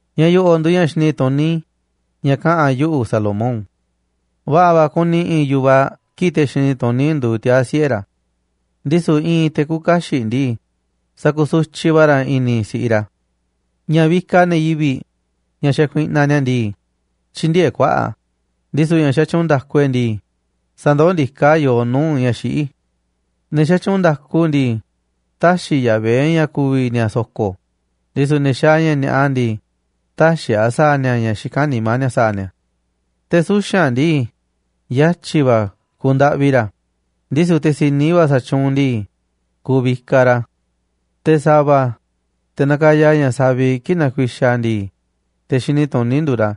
Ña̱ yo̱ꞌo̱ꞌ nduuꞌ ña̱ xini tuní ña̱ kaꞌa̱n yuꞌu̱, Salomón. Va̱ꞌa̱ va̱ kuni i̱i̱n yu̱vaꞌ kii̱ꞌ te̱ xini tuní nduuꞌ tiaa̱ siꞌe̱ ra̱, ndisu̱ i̱i̱n te̱ küuꞌ kaxiꞌ ndii, sakusutyiꞌ va̱ ra̱ i̱ni̱ si̱ꞌiꞌ ra̱. Ña̱ vikaꞌ ne̱ yivi̱ꞌ, ña̱ xakuiꞌnaꞌ ni̱a̱ ndii, tyïndieeꞌ kuaꞌa̱ꞌ a̱, ndisu̱ ña̱ xatyuunꞌ nda̱ku e̱ꞌ ndii, sandoó ndiká a̱ yooꞌ nuu̱ꞌ ña̱ xiꞌí. Ne̱ xatyuunꞌ nda̱ku ndii, tä̱xi̱ Yahvé ña̱ ku̱vi̱ ni̱a̱ so̱ko̱, ndisu̱ ne̱ xaaꞌ ña̱ ni̱a̱ꞌa ndii, tä̱xi̱ a̱ sa̱a̱ ni̱a̱ ña̱ xikán nimá ni̱a̱ sa̱a̱ ni̱a̱. Te̱ suxa̱nꞌ ndii, yatyi̱ va̱ kuuꞌ ndaꞌvi ra̱, ndisu̱ te̱ si̱ni va̱ sa̱tyuunꞌ ndii, kuuꞌ vikaꞌ ra̱. Te̱ sa̱va̱, te̱ nakaya ña̱ saviꞌ kii̱ꞌ nakuixaꞌ a̱ ndii, te̱ xini tuní nduuꞌ ra̱,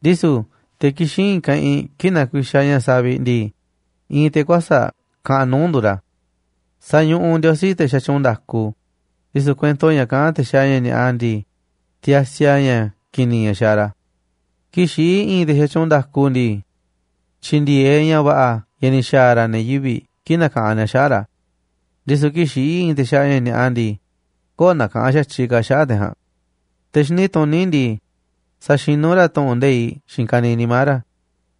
ndisu̱ te̱ kixín i̱i̱n keꞌinꞌ kii̱ꞌ nakuixaꞌ ña̱ saviꞌ ndii, i̱i̱n te̱ kuäsa̱ꞌ kaꞌanꞌ nuu̱ꞌ nduuꞌ ra̱. Sañuꞌuꞌ Ndiosí te̱ xatyuunꞌ nda̱ku, ndisu̱ kuento ña̱ kaꞌán te̱ xaaꞌ ña̱ ni̱a̱ꞌa ndii, tiasi a̱ ña̱ ki̱ni̱ ña̱ xaaꞌ ra̱. Kii̱ꞌ xiꞌí i̱i̱n te̱ xatyuunꞌ nda̱ku ndii, tyi̱ndi̱e̱eꞌ ña̱ va̱ꞌa̱ ña̱ ni̱ xa̱a̱ ra̱ ne̱ yivi̱ꞌ kii̱ꞌ nakaꞌanꞌ ni̱a̱ xaꞌa̱ꞌ ra̱, ndisu̱ kii̱ꞌ xiꞌí te̱ xaaꞌ ña̱ ni̱a̱ꞌa ndii, köo̱ꞌ nakaꞌanꞌ xa̱tyiꞌ ka̱ xaꞌa̱ꞌ te̱ ja̱a̱nꞌ. Te̱ xini tuní ndii, saxinú ra̱ tu̱ꞌu̱n nde̱iꞌ xiinꞌ ka̱niiꞌ nimá ra̱,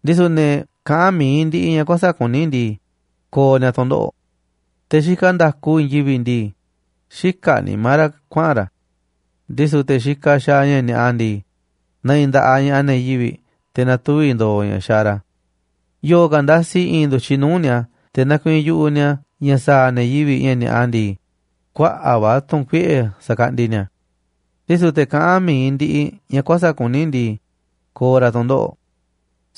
ndisu̱ ne̱ kaꞌán mi̱iꞌ ndiꞌiꞌ ña̱ kuäsa̱ꞌ kuní ndii, ko̱o̱ ni̱a̱ tu̱ndoꞌo̱ꞌ. Te̱ xikaꞌ nda̱ku i̱i̱n yivi̱ꞌ ndii, xïkaꞌ nimá ra̱ kuaꞌa̱n ra̱, ndisu̱ te̱ xikaꞌ xaaꞌ ña̱ ni̱a̱ꞌa ndii, ne̱ꞌi̱ nda̱ꞌaꞌ ña̱ꞌaꞌ ne̱ yivi̱ꞌ te̱ na̱tuvi̱ ndo̱o̱ ña̱ xaaꞌ ra̱. Yo̱o̱ ka̱ ndasi i̱i̱n ndu̱tyiꞌ nuu̱ꞌ ni̱a̱ te̱ nakuiinꞌ yu̱ꞌuꞌ ni̱a̱ ña̱ sa̱a̱ ne̱ yivi̱ꞌ ña̱ ni̱a̱ꞌa ndii, kuaꞌa̱ꞌ va̱ tu̱ꞌu̱n kuiꞌe̱ sa̱kaꞌndi ni̱a̱, ndisu̱ te̱ kaꞌán mi̱iꞌ ndiꞌiꞌ ña̱ kuäsa̱ꞌ kuní ndii, ko̱o̱ ra̱ tu̱ndoꞌo̱ꞌ.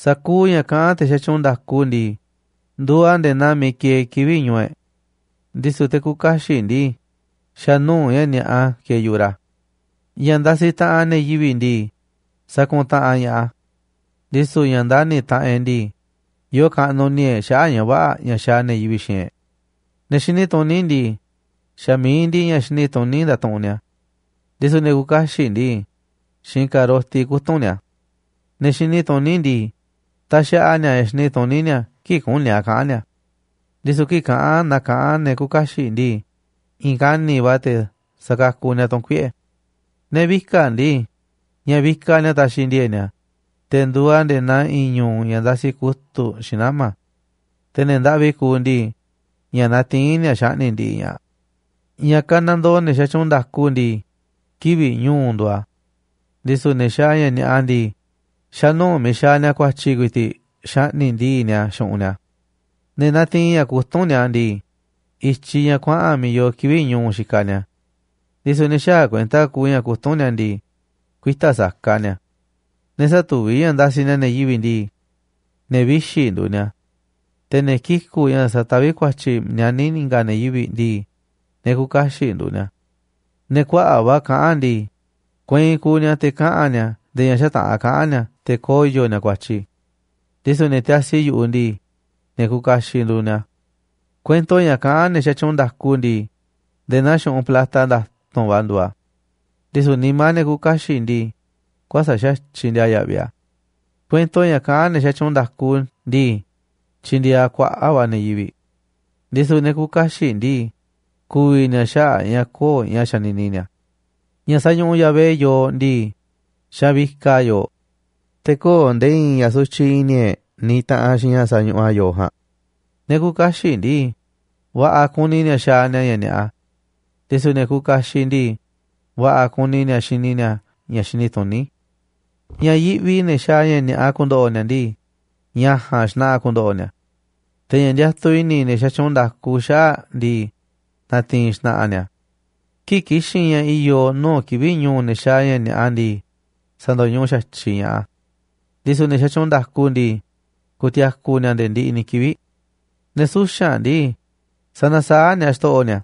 Sa̱kuuꞌ ña̱ kaꞌán te̱ xatyuunꞌ nda̱ku ndii, nduuꞌ a̱ nde̱e̱ naa miiꞌ kieeꞌ kivi̱ꞌ ñu̱u̱ e̱ꞌ, ndisu̱ te̱ küuꞌ kaxiꞌ ndii, xa̱ nuu̱ꞌ ña̱ ni̱a̱ꞌa kieeꞌ yu̱ꞌuꞌ ra̱. Ña̱ ndasiꞌ taꞌanꞌ ne̱ yivi̱ꞌ ndii, sakuntaꞌanꞌ ña̱ꞌaꞌ a̱, ndisu̱ ña̱ ndani̱ taꞌanꞌ e̱ꞌ ndii, yoo kaꞌnuꞌ i̱ni̱ e̱ꞌ xaꞌa̱ꞌ ña̱ vä̱ꞌa̱ ña̱ xaaꞌ ne̱ yivi̱ꞌ xiinꞌ e̱ꞌ. Ne̱ xini tuní ndii, xa̱ mi̱iꞌ ndiꞌiꞌ ña̱ xini tuní ndatuꞌunꞌ nia̱, ndisu̱ ne̱ küuꞌ kaxiꞌ ndii, xiinꞌ ka̱roti kutu̱nꞌ nia̱. Ne̱ xini tuní ndii, taxaꞌa nia̱ ña̱ xini tuní nia̱ kii̱ꞌ küní a̱ kaꞌa̱n nia̱ a̱, ndisu̱ kii̱ꞌ kaꞌán na kaꞌán ne̱ küuꞌ kaxiꞌ ndii, i̱i̱n kani̱ꞌ va̱ te̱ sa̱kakuꞌ nia̱ tu̱ꞌu̱n kuiꞌe̱. Ne̱ vika̱ꞌ ndii, ña̱ vikaꞌ nia̱ taxiꞌ ndi̱e̱e̱ꞌ nia̱, te̱ nduuꞌ a̱ nde̱e̱ naa i̱i̱n ñu̱u̱ ña̱ ndasi kutu̱ꞌ xiinꞌ nama̱. Te̱ ne̱ ndaꞌvi kuuꞌ ndii, ña̱ natiín nia̱ xaꞌni̱ꞌ ndiꞌiꞌ ña̱ꞌaꞌ. Ña̱ kanandoo ne̱ xatyuunꞌ nda̱ku ndii, kivi̱ꞌ ñu̱u̱ nduuꞌ a̱, ndisu̱ ne̱ xaaꞌ ña̱ ni̱a̱ꞌa ndii, xa̱nuu̱ꞌ miiꞌ xaaꞌ nia̱ ku̱a̱tyi̱ ku̱i̱ti̱ꞌ xaꞌni̱ꞌ ndii̱ꞌ nia̱ xu̱ꞌunꞌ nia̱. Ne̱ natiinꞌ ña̱ kutúnꞌ ni̱a̱ ndii, i̱tyiꞌ ña̱ kuaꞌa̱n miiꞌ yoo kivi̱ꞌ ñu̱u̱ xikaꞌ ni̱a̱, ndisu̱ ne̱ xäaꞌ kuenta kuuꞌ ña̱ kutúnꞌ ni̱a̱ ndii, kuita̱ saka ni̱a̱. Ne̱ sätuví ña̱ ndasiꞌ ni̱a̱ ne̱ yivi̱ꞌ ndii, ne̱ vixi̱ nduuꞌ ni̱a̱. Te̱ ne̱ kiku̱ꞌ ña̱ sataví ku̱a̱tyi̱ nianí i̱nga̱ ne̱ yivi̱ꞌ ndii, ne̱ küuꞌ kaxiꞌ nduuꞌ ni̱a̱. Ne̱ kuaꞌa̱ꞌ va̱ kaꞌán ndii, kueinꞌ kuuꞌ ni̱a̱ te̱ kaꞌa̱n ni̱a̱ nde̱e̱ ña̱ xätaꞌa̱n kaꞌa̱n ni̱a̱ te̱ koyo̱ ni̱a̱ ku̱a̱tyi̱, ndisu̱ ne̱ tiasi yu̱ꞌuꞌ ndii, ne̱ kuuꞌ kaxiꞌ nduuꞌ ni̱a̱. Kuento ña̱ kaꞌán ne̱ xatyuunꞌ nda̱ku ndii, nde̱e̱ naa xu̱ꞌunꞌ plata nda̱tu̱nꞌ va̱ nduuꞌ a̱, ndisu̱ nimá ne̱ küuꞌ kaxiꞌ ndii, kuäsa̱ꞌ xa̱tyiꞌ ndiaa yaꞌviꞌ a̱. Kuento ña̱ kaꞌán ne̱ xatyuunꞌ nda̱ku ndii, tyindieeꞌ a̱ kuaꞌa̱ꞌ va̱ ne̱ yivi̱ꞌ, ndisu̱ ne̱ küuꞌ kaxiꞌ ndii, ku̱vi̱ ni̱a̱ xaꞌa̱ꞌ a̱ ña̱ köo̱ꞌ ña̱ xanini ni̱a̱. Ña̱ sañuꞌuꞌ Yahvé yooꞌ ndii, xavikaꞌ a̱ yooꞌ. Te̱ köo̱ꞌ nde̱e̱ i̱i̱n ña̱ sutyiꞌ i̱ni̱ e̱ꞌ niꞌiꞌ taꞌanꞌ xiinꞌ ña̱ sañuꞌuꞌ a̱ yooꞌ ja̱a̱nꞌ. Ne̱ küuꞌ kaxiꞌ ndii, va̱ꞌa̱ kuni ni̱a̱ xaaꞌ ni̱a̱ ña̱ ni̱a̱ꞌa, ndisu̱ ne̱ kuuꞌ kaxiꞌ ndii, va̱ꞌa̱ kuni ni̱a̱ xini ni̱a̱ ña̱ xini tuní. Ña̱ yiꞌvi ne̱ xaaꞌ ni̱a̱ꞌa ku̱ndo̱ꞌo̱ ni̱a̱ ndii, ña̱ ja̱a̱nꞌ xna̱ꞌa̱ ku̱ndo̱ꞌo̱ ni̱a̱. Te̱ ña̱ ndiatuꞌ i̱ni̱ ne̱ xatyuunꞌ nda̱ku xaꞌa̱ꞌ ndii, na̱ti̱i̱n xna̱ꞌa̱ ni̱a̱ a̱. Kii̱ꞌ ki̱xi̱n ña̱ i̱yo̱ nuu̱ꞌ kivi̱ꞌ ñu̱u̱ ne̱ xaaꞌ ña̱ ni̱a̱ꞌa ndii, sa̱ndo̱ñuꞌuꞌ xa̱tyiꞌ ña̱ꞌaꞌ a̱, ndisu̱ ne̱ xatyuunꞌ nda̱ku ndii, ku̱ti̱a̱ku̱ ni̱a̱ nde̱e̱ ndiꞌiꞌ ni̱ kivi̱ꞌ. Ne̱ suxa̱nꞌ ndii, sanasaáꞌ ni̱a̱ xto̱ꞌo̱ ni̱a̱,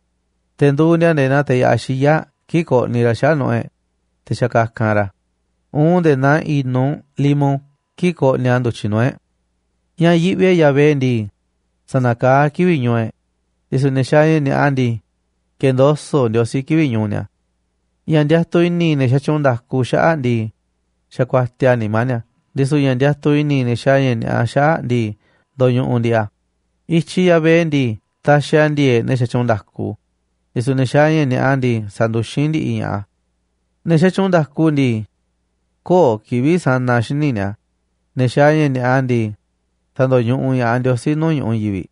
te̱ nduuꞌ ni̱a̱ nde̱e̱ naa teꞌ ya̱ꞌaꞌ xiyáꞌ kii̱ꞌ koꞌniꞌ raꞌ xaꞌa̱ꞌ nu̱ꞌu̱ e̱ꞌ, te̱ xakakanꞌ raꞌ a̱, uun nde̱e̱ naa i̱nuꞌ limo kii̱ꞌ koꞌniꞌ a̱ ndu̱tyiꞌ nuu̱ꞌ e̱ꞌ. Ña̱ yiꞌvi e̱ꞌ Yahvé ndii, sa̱na̱kaá a̱ kivi̱ꞌ ñu̱u̱ e̱ꞌ, ndisu̱ ne̱ xaaꞌ ña̱ ni̱a̱ꞌa ndii, ke̱ndoso̱ꞌ Ndiosí kivi̱ꞌ ñu̱u̱ ni̱a̱. Ña̱ ndiatuꞌ i̱ni̱ ne̱ xatyuunꞌ nda̱ku xaꞌa̱ꞌ ndii, xakuatiaꞌ a̱ nimá ni̱a̱, ndisu̱ ña̱ ndiatuꞌ i̱ni̱ ne̱ xaaꞌ ña̱ ni̱a̱ꞌa xaꞌa̱ꞌ ndii, ndo̱ñuꞌuꞌ ndi̱ꞌi̱ a̱. I̱tyiꞌ Yahvé ndii, taxiꞌ a̱ ndi̱e̱e̱ꞌ ne̱ xatyuunꞌ nda̱ku, ndisu̱ ne̱ xaaꞌ ña̱ ni̱a̱ꞌa ndii, sanduxín ndi̱ꞌi̱ ña̱ꞌaꞌ a̱. Ne̱ xatyuunꞌ nda̱ku ndii, köo̱ꞌ kivi̱ꞌ sa̱na̱ xíniꞌ ni̱a̱, ne̱ xaaꞌ ña̱ ni̱a̱ꞌa ndii, sa̱ndo̱ñuꞌuꞌ ña̱ꞌaꞌ Ndiosí nuu̱ꞌ ñu̱ꞌuꞌ i̱i̱n yivi̱ꞌ.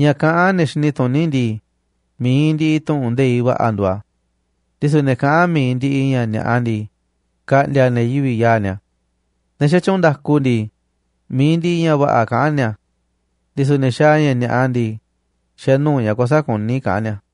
Ña̱ kaꞌán ne̱ xini tuní ndii, mi̱iꞌ ndiꞌiꞌ tu̱ꞌu̱n nde̱iꞌ va̱ꞌa̱ nduuꞌ a̱, ndisu̱ ne̱ kaꞌán mi̱iꞌ ndiꞌiꞌ ña̱ ni̱a̱ꞌa ndii, ka̱ꞌndi̱a̱ ne̱ yivi̱ꞌ yaa̱ꞌ ni̱a̱. Ne̱ xatyuunꞌ nda̱ku ndii, mi̱iꞌ ndiꞌiꞌ ña̱ va̱ꞌa̱ kaꞌán ni̱a̱, ndisu̱ ne̱ xaaꞌ ña̱ ni̱a̱ꞌa ndii, xa̱ nuu̱ꞌ ña̱ kuäsa̱ꞌ kuní kaꞌán ni̱a̱.